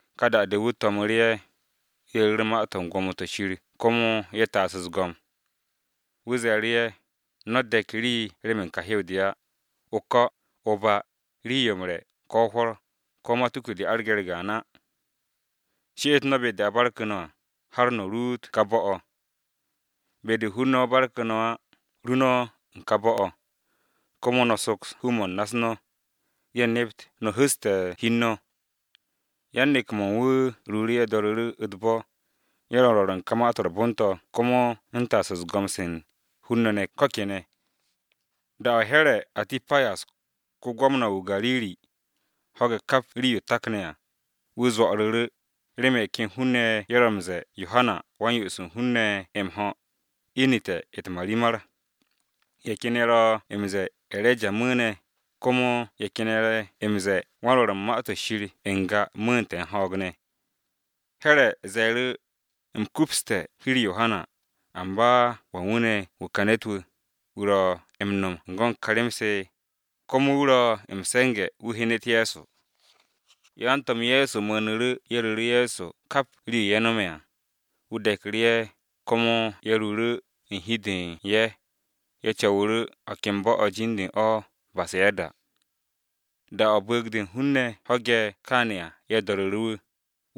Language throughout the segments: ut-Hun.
Ka da-de wu̱ to̱mu̱ru̱ ye̱, ye̱ ru̱r ma-to̱ u̱n gwo̱mo-to̱ Shir komo ye̱ taas u̱s-go̱m. Wu̱ ze̱e̱ru̱ ye̱, “No̱ de̱k rii remen ka hew-de á, o-ko̱, ko̱ o-ba, rii-yo m-re̱, ko̱ hwo̱r, ko̱ matuku-de arge̱ u̱r-gaan á. She'et no̱ be-de a barku̱ no̱ à, har no̱ ruut u̱n ka bo̱-o̱. Be-de hun-ne̱ barku̱ no̱ á, ru no̱ u̱n ka bo̱-o̱, komo no̱ soks hu-mo̱ u̱n na-u̱s no̱, ye̱ nept no̱ hu̱ste̱ hi u̱n no̱.” Yan-neke̱-mo̱ u̱n wu̱ ruuru̱ ye̱ do̱ru̱ru̱ u̱t-bo̱, ye̱ ro̱ m-rwo̱r u̱n ka Ma-to̱ m-Re̱re̱m to̱ komo u̱n taas u̱n go̱m-se u̱n hun-ne̱ ko̱ kene̱. Da-o̱ Here̱ [Atipas], ko-gwamna-wu̱ o-Gariri, ho̱ge̱ kap rii-yo takan à, wu̱ zo̱'o̱ru̱ru̱, remen ye̱ ken hun-ne̱ ye̱ ro̱ m-ze̱e̱ Yohana [Wa-m-Yo'os u̱n hun-ne̱ n-me̱ m-ho̱] inu̱te̱ u̱t-marimar. Ye̱ ken ye̱ ro̱ m-ze̱e̱, E̱reja mu̱u̱ne̱, komo ye̱ ken ye̱ zee wan-Rwo̱r u̱n Ma-to̱ Shir n-ga mu̱u̱te̱ u̱n ho̱o̱g ne̱. Here̱ ze̱e̱ru̱, “U̱m kupste̱ hi-u̱r Yohana, amba ¿wan wu̱ ne̱ wu̱ ka ne̱t-wu̱, wu̱ ro̱ m-no̱m u̱n go̱n se ka rem-se?” Komo wu̱ ro̱ m-se̱nge̱ wu̱ hyenet Ye̱so. Yan-To̱m Ye̱so mu̱u̱nu̱ru̱ komo ye̱ ru̱ru̱ Ye̱so kap rii-yo ye̱ no̱me̱ à. Wu̱ de̱ku̱ru̱ ye̱, komo ye̱ ruuru̱ u̱n hi u̱n de u̱n ye̱, ye̱ co̱wu̱ru̱ o̱ ken bo̱-o̱ jin-de u̱n o̱ o-Besayada. Da-o̱ bu̱u̱g-de u̱n hun-ne̱ ho̱ge̱ kaane̱ à, ye̱ do̱ru̱ru̱ wu̱.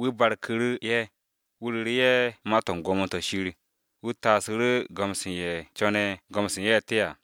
Wu̱ barku̱ru̱ ye̱, wu̱ ru̱ru̱ ye̱ ma-to̱ u̱n gwo̱mo-to̱ Shir, wu̱ taasu̱ru̱ go̱m-se u̱n ye̱ co̱ne̱ go̱m-se u̱n ye̱ te à.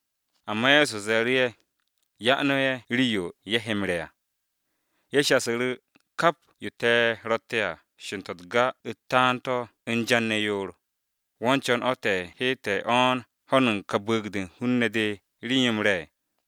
Amba Ye̱so ze̱e̱ru̱ ye̱, “Ya no̱ ye̱ rii-yo ye̱ he m-re̱ à.” Ye̱ shasu̱ru̱, “Kap yo te̱ ro̱tte̱ à sho̱n-to̱ u̱t-ga u̱t-taan to̱ u̱n jan ne̱ yoor, ¿wo̱ u̱n co̱n o̱ te̱ he te̱ o̱ne̱ ho̱n u̱n ka bu̱u̱g-de u̱n hun-ne̱ de rii-yo m-re̱?”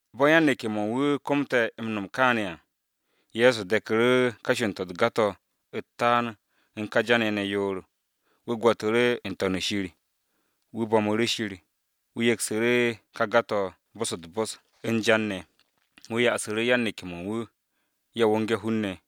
Bo̱ yan-neke̱-mo̱ u̱n wu̱ komte̱ m-no̱m kaane̱ à, Ye̱so de̱ku̱ru̱ ka buro̱di-u̱t taan-to̱ u̱n ka jan-ye̱ ne̱ yoor, wu̱ gwo̱tu̱ru̱ n-To̱n u̱n shir, wu̱ bo̱mu̱ru̱ Shir, wu̱ yeksu̱ru̱ ka ga-to̱ bo̱s-u̱t-bo̱s u̱n jan ne̱. Wu̱ yasu̱ru̱ yan-neke̱-mo̱ u̱n wu̱, ye̱ wonge̱ hun-ne̱.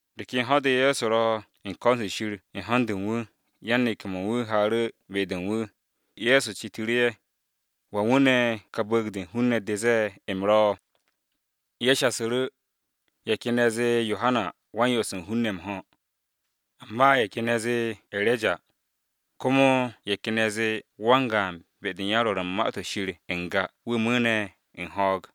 De ken ho̱-de Ye̱so ro̱ u̱n ko̱n-se Shir u̱n ho̱n-de u̱n wu̱, yan-neke̱-mo̱ u̱n wu̱ haaru̱ be-de u̱n wu̱. Ye̱so citu̱ru̱ ye̱. “¿Wan wu̱ ne̱ ka bu̱u̱g-de u̱n hun-ne̱ de zee u̱m ro̱?” Ye̱ shasu̱ru̱, “Ye̱ ken ne̱ zee Yohana Wa-m-Yo'os u̱n hun-ne̱ m-ho̱. Amba ye̱ ken ye̱ zee E̱reja wu̱, komo ye̱ ken ye̱ zee wan-gaan be-de u̱n yan-rwo̱r u̱n Ma-to̱ Shir n-ga wu̱ mu̱u̱ne̱ u̱n ho̱o̱g.”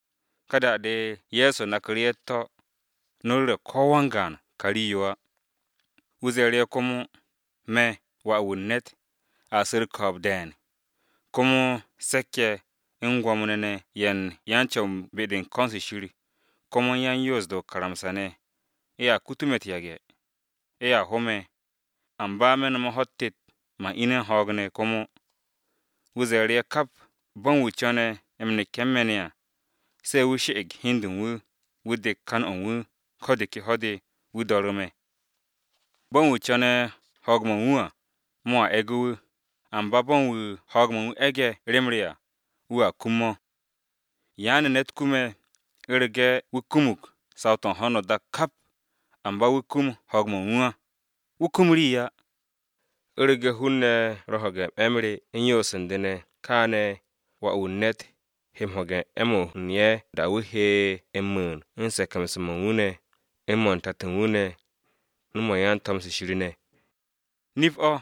Ka da-de Ye̱so naku̱ru̱ ye̱ u̱t-to̱, “No̱ ru̱re̱ ko-wan-gaan ka rii-yo á.” Wu̱ ze̱e̱ru̱ ye̱ komo, “Me̱ Wà-wu̱ u̱n ne̱t a su̱ u̱r-ko̱o̱b de̱e̱n, komo se̱k-ye̱, u̱n Gwo̱mo-ne̱ ye̱ u̱n ko̱n-se Shir, komo u̱n yan-Yoos-de o-karamsa ne̱, ye̱a kutu me̱ u̱t-yage̱. Ye̱a ho me̱, amba me̱ no̱me̱ ho̱-u̱t tet, man ine̱ u̱n ho̱o̱g ne̱ komo.” Wu̱ ze̱e̱ru̱ ye̱ kap, “Bo̱ u̱n wu̱ co̱ne̱ m-neke̱ u̱n me̱ ne̱ à, se̱ wu̱, she̱'e̱g hi u̱n de u̱n wu̱, wu̱ dek kan-o̱ u̱n wu̱ ko̱ de ke ho̱-de, wu̱ do̱ru̱ me̱. Bo̱ u̱n wu̱ co̱ne̱ wuke̱ u̱n ho̱o̱g-mo̱ u̱n wu̱ à, mo̱a e̱ge̱ wu̱, amba bo̱ u̱n wu̱ ho̱o̱g-mo̱ u̱n wu̱ e̱ge̱ rem re à, wu̱a kum mo̱. ¿Yaane̱ ne̱t kume̱, u̱rege̱ wu̱ kumug saw-to̱ u̱n ho̱no o-dak kap, amba wu̱ kum ho̱o̱g-mo̱ u̱n wu̱ á? Wu̱ kum rii á. U̱rege̱ hun-ne̱ ro̱ m-ho̱ge̱ 'e̱-m re u̱n yoos u̱n de ne̱, kaane̱ Wà-wu̱ u̱n ne̱t he m-ho̱ge̱ 'e̱-mo̱ u̱n ye̱ da-o̱ wu̱ he m-mu̱u̱n u̱n se̱ke̱mse̱-mo̱ u̱n wu̱ ne̱, u̱n mo̱ u̱n tato u̱n wu̱ ne̱, u̱n mo̱ u̱n yan-to̱m-se Shir ne̱ à. Nip-o̱,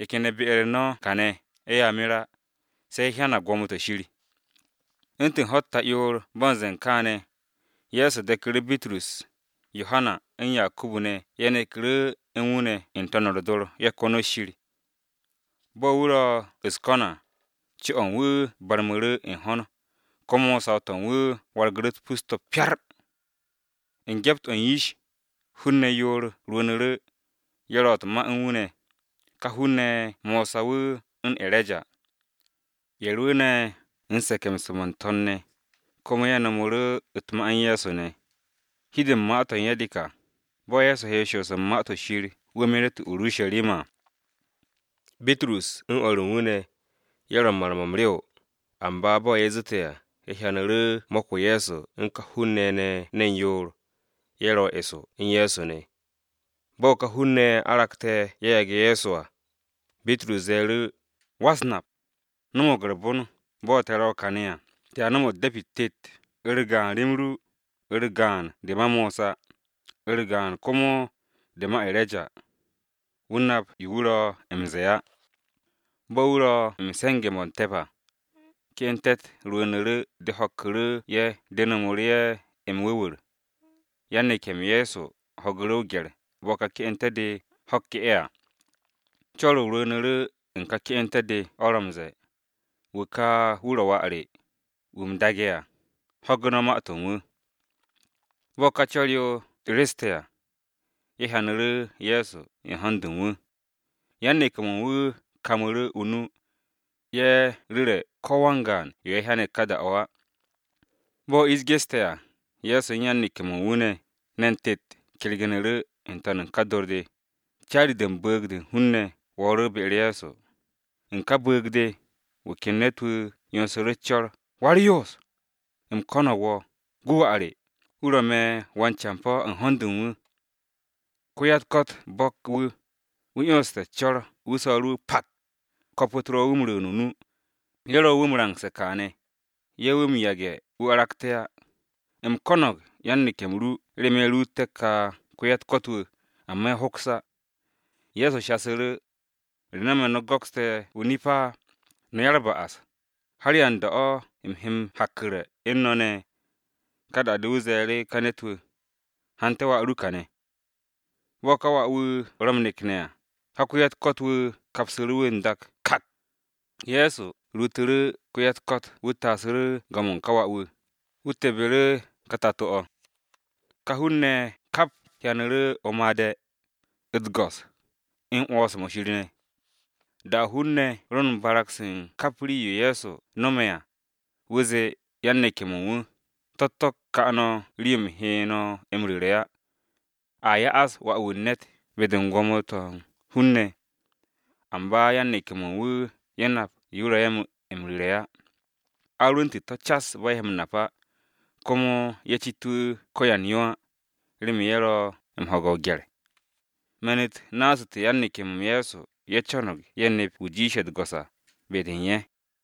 ye̱ ken ye̱ be-u̱r no̱ kane̱, ye̱a mer á, se ye̱ hyanag gwo̱mo-to̱ Shir.” U̱ntu̱n ho̱-u̱t ta'yoor bo̱ m-ze̱e̱ kaane̱, Ye̱so de̱ku̱ru̱ Bitrus, Yohana u̱n Yakubu ne̱ ye̱ neke̱ru̱ u̱n wu̱ ne̱ n-to̱n u̱r-dor ye̱ konot Shir. Bo̱ wu̱ ro̱ u̱s-ko̱n à, co-o̱ u̱n wu̱ barmu̱ru̱ u̱n ho̱n, komo saw-to̱ u̱n wu̱ wargu̱ru̱ u̱t-pus to̱ pyar. U̱n gyept-o̱ u̱n yish, hun-ne̱ yoor rwu̱u̱nu̱ru̱, ye̱ ro̱ u̱t-ma u̱n wu̱ ne̱. Ka hun-ne̱ ye̱ Mosa wu̱ u̱n E̱reja. Ye̱ rwu̱u̱ne̱ u̱n se̱ke̱mse̱-mo̱ n-to̱n ne̱, komo ye̱ no̱mu̱ru̱ u̱t-ma u̱n Ye̱so ne̱. Hi-de u̱n ma-to̱ u̱n ye̱ de ka, bo̱ Ye̱so he m-shoos u̱n Ma-to̱ Shir wu̱ meret o-Urusharima à. Bitrus u̱n o̱r u̱n wu̱ ne̱, ye̱ ro̱ u̱n mar-mo̱ m-rew, amba bo̱ ye̱ zu̱te̱ à, ye̱ hyanu̱ru̱ mo̱k-o Ye̱so u̱n ka hun-ne̱ ye̱ ne̱ ne̱n yoor. Ye̱ ro̱ eso u̱n Ye̱so ne̱. Bo̱ ka hun-ne̱ ye̱ aragte̱ ye̱ yage̱ Ye̱so à, Bitrus ze̱e̱ru̱ wu̱, “Go̱s-wu̱, no̱mo̱g u̱r-bon bo̱ te̱ ro̱ kane̱ à! Te̱a no̱m de̱pi-u̱t tet, u̱r-gaan rem ru, u̱r-gaan de ma Mosa, u̱r-gaan komo, de ma E̱reja.” (Wu̱ nap yo wu̱ ro̱ m-ze̱e̱ á.) Bo̱ wu̱ ro̱ m-se̱nge̱ mo̱ te̱p à, ke'ente̱-u̱r rwu̱u̱nu̱ru̱ de ho̱kku̱ru̱ ye̱ de nomu̱ru̱ ye̱ m-wu̱wu̱r, yan-neke̱-m Ye̱so ho̱gu̱ru̱ o-gye̱r bo̱ ka ke'ente̱-de ho̱kke̱ ye̱ à. Co̱r-o rwu̱u̱nu̱ru̱ u̱n ka ke'ente̱-de o̱ ro̱ m-ze̱e̱, “Wu̱ ka, wu̱ ro̱ wà re, wu̱ u̱m daage̱ à, ho̱gu̱ no̱ ma-to̱ u̱n wu̱!” Bo̱ ka co̱r-o re̱ste̱ à, ye̱ hyanu̱ru̱ Ye̱so u̱n ho̱n-de u̱n wu̱. Yan-neke̱-mo̱ u̱n wu̱ kamu̱ru̱ o-nu, ye̱ ru̱re̱ ko-wan-gaan yo ye̱ hyane̱ ka da-o̱ á. Bo̱ ish geste̱ à, Ye̱so u̱n yan-neke̱-mo̱ u̱n wu̱ ne̱ ne̱n tet kergu̱nu̱ru̱ n-to̱n u̱n ka dor-de, caari-de u̱n bu̱u̱g-de u̱n hun-ne̱ wo̱o̱ru̱ be-u̱r Ye̱so. U̱n ka bu̱u̱g-de, wu̱ ken ne̱t-wu̱ 'yonsu̱ru̱ u̱s-co̱r, “Wa-u̱r-Yoos! U̱m ko̱no̱g wo̱, gu wà re, wu̱ ro̱ me̱ wan-campo̱ u̱n ho̱n-de u̱n wu̱! Ko-ya-u̱t-ko̱t bo̱k wu̱, wu̱ 'yonste̱ u̱s-co̱r wu̱ so̱ru̱ wu̱ pak, ko̱p-u̱t ro̱ m-rwu̱u̱n o-nu, ye̱ ro̱ wu̱ m-rangse̱ kaane̱, ye̱ wu̱ m-yage̱ wu̱ aragte̱ á! U̱m ko̱no̱g yan-neke̱-m ru remen ye̱ ruuté̱ ka wa-u̱t-ko̱t wu̱, amba ye̱ hoks á.” Ye̱so shasu̱ru̱, “Re no̱me̱ ne̱ no̱ go̱kste̱ o-nip á, no̱ ya-u̱r-ba'as! ¿Har yan da-o̱ u̱m he m-hakku̱re̱ u̱n no̱ ne̱?” Ka da-de wu̱ ze̱e̱ru̱ ka ne̱t-wu̱, “Hante̱ wà ru kane̱.” Bo̱ ka wà-wu̱ ro m-nekne̱ à, ka wa-u̱t-ko̱t wu̱ kapsu̱ru̱ wu̱ n-dak kak. Ye̱so huru̱ wa-u̱t-ko̱t u̱t-gaag. Wu̱ taasu̱ru̱ go̱m-o̱ u̱n ka wà-wu̱, wu̱ tebbu̱ru̱ ka tato-o̱. Ka hun-ne̱ ye̱ kap hyanu̱ru̱ o-made̱, u̱t-go̱s, u̱n 'wo̱ns-mo̱ Shir ne̱. Da-o hun-ne̱ ro̱ u̱n barag-se u̱n kap rii-yo Ye̱so ro̱ m-no̱m à, wu̱ zee yan-neke̱-mo̱ u̱n wu̱, “To̱-u̱t to̱ ka no̱ rii-yo u̱m he no̱ m-ru̱re̱ á! A ya'as Wà-wu̱ u̱n ne̱t be-de u̱n gwo̱mo-to̱ u̱n hun-ne̱.” Amba yan-neke̱-mo̱ u̱n wu̱ ye̱ nap yo wu̱ ro̱ ye̱ m-ru̱re̱ á. A rwu̱nte̱ to̱ cas bo̱ ye̱ he m-nap á, komo ye̱ cit wu̱ ko̱ yan yo á, remen ye̱ ro̱ m-ho̱ge̱ o-gye̱r. Ma-u̱t su̱nu̱te̱ yan-neke̱-m Ye̱so ye̱ co̱no̱g ye̱ nep wu̱ jiishe̱ u̱t-go̱s à, be-de u̱n ye̱.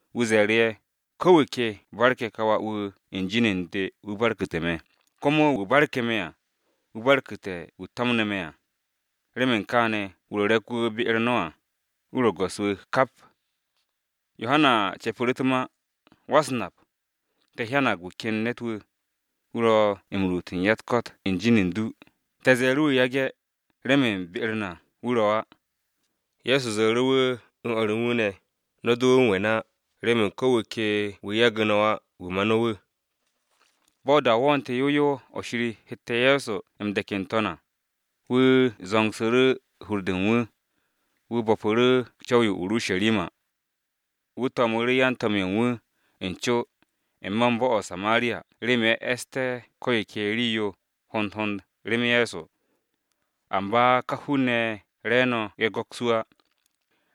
Wu̱ ze̱e̱ru̱ ye̱, “Ko̱ wu̱ ke barke̱ ka wà-wu̱ u̱n jin u̱n de, wu̱ barku̱tu̱ me̱, komo wu̱ barku̱ me̱ à, wu̱ barku̱te̱ wu̱ to̱mne̱ me̱ à. Remen kaane̱ wu̱ ro̱ re̱k-wu̱ be-u̱r no̱ à, wu̱ ro̱ go̱s-wu̱ kap.” Yohana ce̱pu̱ru̱ u̱t-ma, “Go̱s-wu̱, te̱ hyanag wu̱ ken ne̱t-wu̱, wu̱ ro̱ m-ruut u̱n ya-u̱t-ko̱t u̱n jin u̱n du, te̱ ze̱e̱ru̱ wu̱ yage̱, remen be-u̱r na wu̱ ro̱ á.” Ye̱so ze̱e̱ru̱ wu̱ u̱n o̱r u̱n wu̱ ne̱, “No̱ do wu̱ m-we̱n á, remen ko̱ wu̱ ke wu̱ yagu̱ no̱ á wu̱ ma no̱ wu̱.” Bo̱ da-o wo̱o̱te̱ yow yow o̱ Shir hette̱ Ye̱so m-de̱k n-to̱n à, wu̱ zo̱ngsu̱ru̱ hur-de u̱n wu̱, wu̱ bo̱pu̱ru̱ co̱w-yo o-Urusharima. Wu̱ to̱mu̱ru̱ yan-to̱m-ye̱ u̱n wu̱ u̱n co, n-me̱ bo̱-o o-Samariya remen ye̱ e̱sté̱ ko̱ yo ke rii-yo hond hond rem Ye̱so. Amba ka hun-ne̱ ye̱ re̱e̱no̱ ye̱ go̱ks wu̱ á,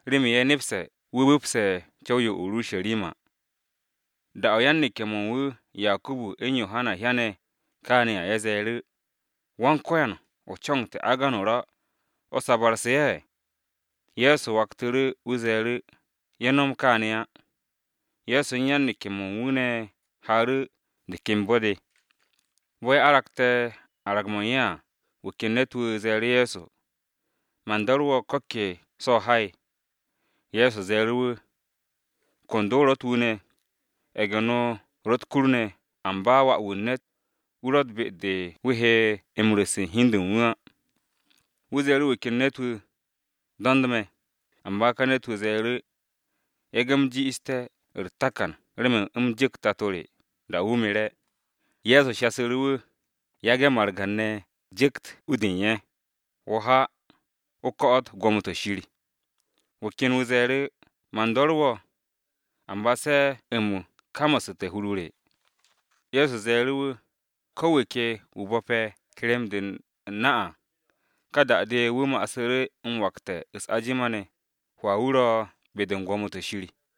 remen ye̱ nepse̱ wu̱ bu̱pse̱ co̱w-yo o-Urusharima. Da-o̱ yan-neke̱-mo̱ u̱n wu̱ Yakubu u̱n Yohana hyane̱ kaane̱ à, ye̱ ze̱e̱ru̱, “Go̱s-wu̱, ¿o co̱no̱g te̱ agan o-ra n-to̱n o̱ sabu̱rse̱ ye̱?” Ye̱so waktu̱ru̱ wu̱ kangsu̱ru̱ ye̱. Ye̱so u̱n yan-neke̱-mo̱ u̱n wu̱ ne̱ haaru̱ de ken bo̱-de. Bo̱ ye̱ aragte̱ arag-mo̱ u̱n ye̱ à, wu̱ ken ne̱t-wu̱ ze̱e̱ru̱ Ye̱so, “Man do̱re̱ wo̱ ko̱ ke so̱ o ha'e̱.” Ye̱so ze̱e̱ru̱ wu̱, “Kondo ro̱ u̱t-wu ne̱, ye̱ge̱-no ro̱ u̱t-kur ne̱, amba Wà-wu̱ u̱n ne̱t ro̱tt be-de wu̱ he m-ru̱s u̱n hi-de u̱n wu̱ á.” Wu̱ ze̱e̱ru̱ wu̱ ken ne̱t-wu̱, “Do̱nd me̱.” Amba ka ne̱t-wu̱ ze̱e̱ru̱, “Go̱s-wu̱, yage̱ u̱m ji'iste̱ u̱r-takan remen u̱m ju̱kt tato re, da-o̱ wu̱ mere̱.” Ye̱so shasu̱ru̱ wu̱, “Yage̱ margan-ne̱ ju̱kt u-de u̱n ye̱. Wo̱ ha, o ko̱'o̱t gwo̱mo-to̱ Shir.” Wu̱ ken wu̱ ze̱e̱ru̱, “Go̱s-wu̱, man do̱re̱ wo̱, amba se u̱m kamasu̱te̱ hur-o re.” Ye̱so ze̱e̱ru̱ wu̱, “Ko̱ wu̱ ke wu̱ bo̱pe̱ kerem-de u̱n na à, ka da-de wu̱ masu̱ru̱ m-wakte̱ u̱s-ajima ne̱, hwaa-o wu̱ ro̱ be-de u̱n gwo̱mo-to̱ Shir.”